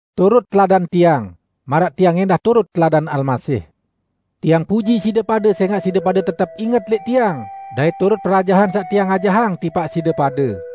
Turut teladan tiang, maraq tiang ẽndah turut teladan Almasih. Tiang puji side pade sẽngaq side pade tetep inget lẽq tiang dait turut perajahan saq tiang ajahang tipaq side pade.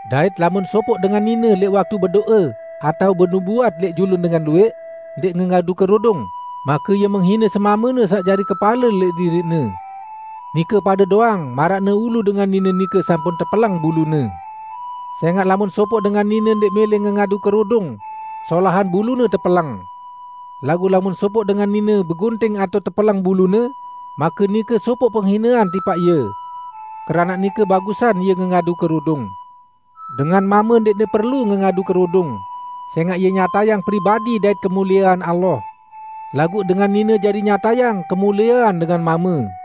Dait lamun sopoq dengan nine lẽq waktu bedo'e atao benubuat lẽq julun dengan luwẽq ndẽq ngengadu kerudung, make ie menghine semamene saq jari kepale lẽq diriqne. Nike pade doang maraqne ulu dengan nine nike sampun tepeleng bulune. Sẽngaq lamun sopoq dengan nine ndẽq mẽlẽ ngengadu kerudung, solahan bulune tepeleng. Laguq lamun sopoq dengan nine begunting atao tepeleng bulune, make nike sopoq penghinean tipaq ie. Keranaq nike bagusan ie ngengadu kerudung. Dengan mame ndẽqne perlu ngengadu kerudung, sẽngaq ie nyatayang pribadi dait kemuliean Allah. Laguq dengan nine jari nyatayang kemuliean dengan mame,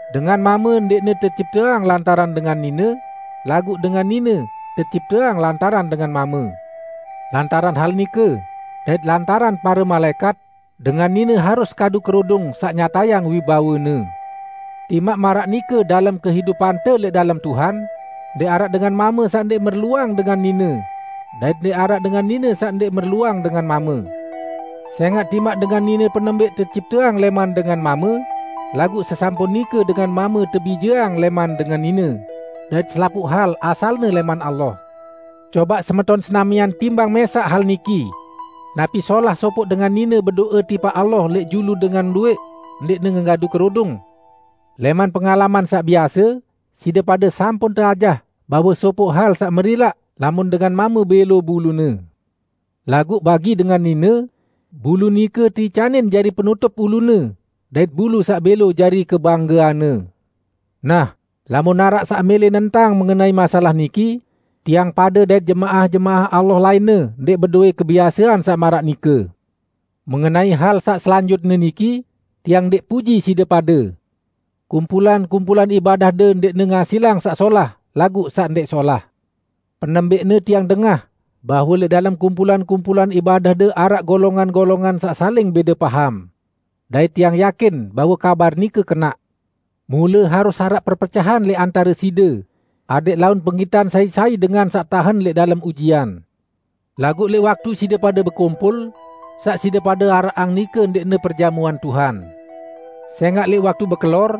Dengan mame ndẽqne tecipteang lantaran dengan nine, laguq dengan nine tecipteang lantaran dengan mame. Lantaran hal nike, dait lantaran pare malaẽkat, dengan nine harus kadu kerudung saq nyatayang wibawene. Timaq maraq nike dalem kehidupante lẽq dalem Tuhan, ndẽq araq dengan mame saq ndẽq merluang dengan nine, dait ndẽq araq dengan nine saq ndẽq merluang dengan mame. Sẽngaq timaq dengan nine penembẽq tecipteang lẽman dengan mame, laguq sesampun nike dengan mame tebijeang lẽman dengan nine; dait selapuq hal asalne lẽman Allah. Cobaq semeton senamian timbang mẽsaq hal niki: Napi solah sopoq dengan nine bedo'e tipaq Allah lẽq julu dengan luwẽq, ndẽqne ngengadu kerudung? Lẽman pengalaman saq biase, side pade sampun teajah bahwe sopoq hal saq merilaq lamun dengan mame bẽlo bulune. Laguq bagi dengan nine, bulu nike teicanin jari penutup ulune dait bulu saq bẽlo jari kebanggeanne. Nah, lamun araq saq mẽlẽ nentang mengenai masalah niki, tiang pade dait jemaah-jemaah Allah lainne ndẽq bedowẽ kebiasean saq maraq nike. Mengenai hal saq selanjutne niki, tiang ndẽq puji side pade. Kumpulan-kumpulan ibadahde ndẽqne ngasilang saq solah, laguq saq ndẽq solah. Penembẽqne tiang dengah, bahwe lẽq dalem kumpulan-kumpulan ibadahde araq golongan-golongan saq saling bẽde paham. Dait tiang yakin bahwe kabar nike kenaq. Mule harus araq perpecahan lẽq antare side, adẽq laun penggitan sai-sai dengan saq tahen lẽq dalem ujian. Laguq lẽq waktu side pade bekumpul, saq side pade araqang nike ndẽqne Perjamuan Tuhan. Sẽngaq lẽq waktu bekelor,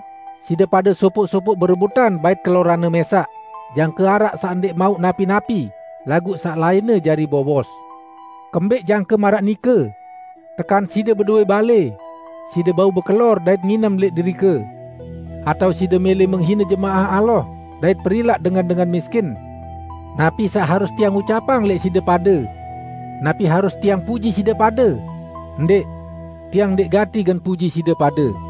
side pade sopoq-sopoq berebutan bait keloranne mẽsaq, jangke araq saq ndẽq mauq napi-napi, laguq saq lainne jari bowos. Kembẽq jangke maraq nike? Tekan side bedowẽ balẽ? Side bau bekelor dait nginem lẽq derike! Atao side mẽlẽ menghine jemaah Allah dait perilaq dengan-dengan miskin? Napi saq harus tiang ucapang lẽq side pade? Napi harus tiang puji side pade? Ndẽq! Tiang ndẽq gati gen puji side pade.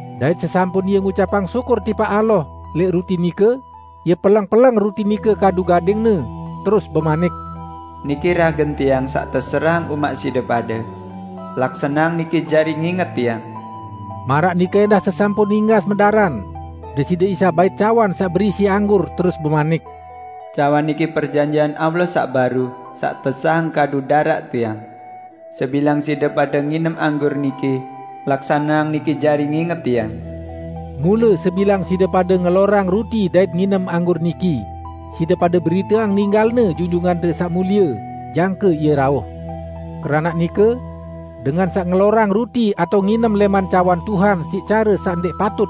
dait sesampun Ie ngucapang syukur tipaq Allah lẽq ruti nike, Ie peleng-peleng ruti nike kadu gading-Ne, terus bemanik, "Niki ragen Tiang saq teserahang umaq side pade. Laksaneang niki jari nginget Tiang." Maraq nike ẽndah sesampun inggas medaran, Deside Isa bait cawan saq berisi anggur terus bemanik, "Cawan niki perjanjian Allah saq baru, saq tesahang kadu daraq Tiang. Sebilang side pade nginem anggur niki, laksaneang niki jari nginget Tiang." Mule sebilang side pade ngelorang ruti dait nginem anggur niki, side pade beriteang ninggal-Ne Junjungante Saq Mulie, jangke Ie rauh. Keranaq nike, dengan saq ngelorang ruti atao nginem lẽman cawan Tuhan siq care saq ndẽq patut,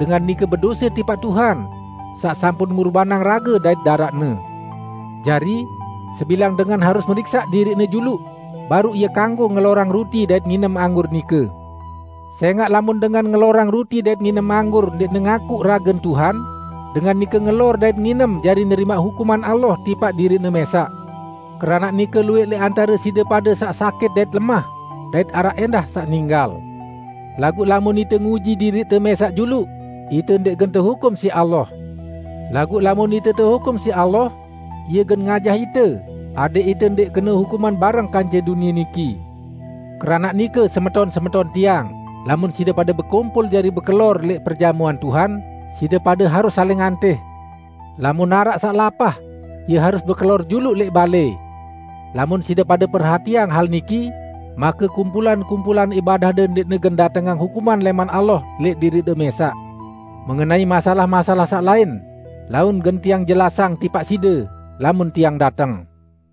dengan nike bedose tipaq Tuhan saq sampun ngurbanang rage dait daraq-Ne. Jari, sebilang dengan harus meriksaq diriqne juluq, baruq ie kanggo ngelorang ruti dait nginem anggur nike. Sẽngaq lamun dengan ngelorang ruti dait nginem anggur ndẽqne ngakuq ragen Tuhan, dengan nike ngelor dait nginem jari nerimaq hukuman Allah tipaq diriqne mẽsaq. Keranaq nike luwẽq lẽq antare side pade saq sakit dait lemah, dait araq ẽndah saq ninggal. Laguq lamun ite nguji diriqte mẽsaq juluq, ite ndẽq gen tehukum siq Allah. Laguq lamun ite tehukum siq Allah, Ie gen ngajah ite, adẽq ite ndẽq kene hukuman bareng kance dunie niki. Keranaq nike, semeton-semeton tiang, lamun side pade bekumpul jari bekelor lẽq perjamuan Tuhan, side pade harus saling antih. Lamun araq saq lapah, ie harus bekelor juluq lẽq balẽ. Lamun side pade perhatiang hal niki, make kumpulan-kumpulan ibadahde ndẽqne gen datengang hukuman lẽman Allah lẽq diriqde mẽsaq. Mengenai masalah-masalah saq lain, laun gen tiang jelasang tipaq side, lamun tiang dateng.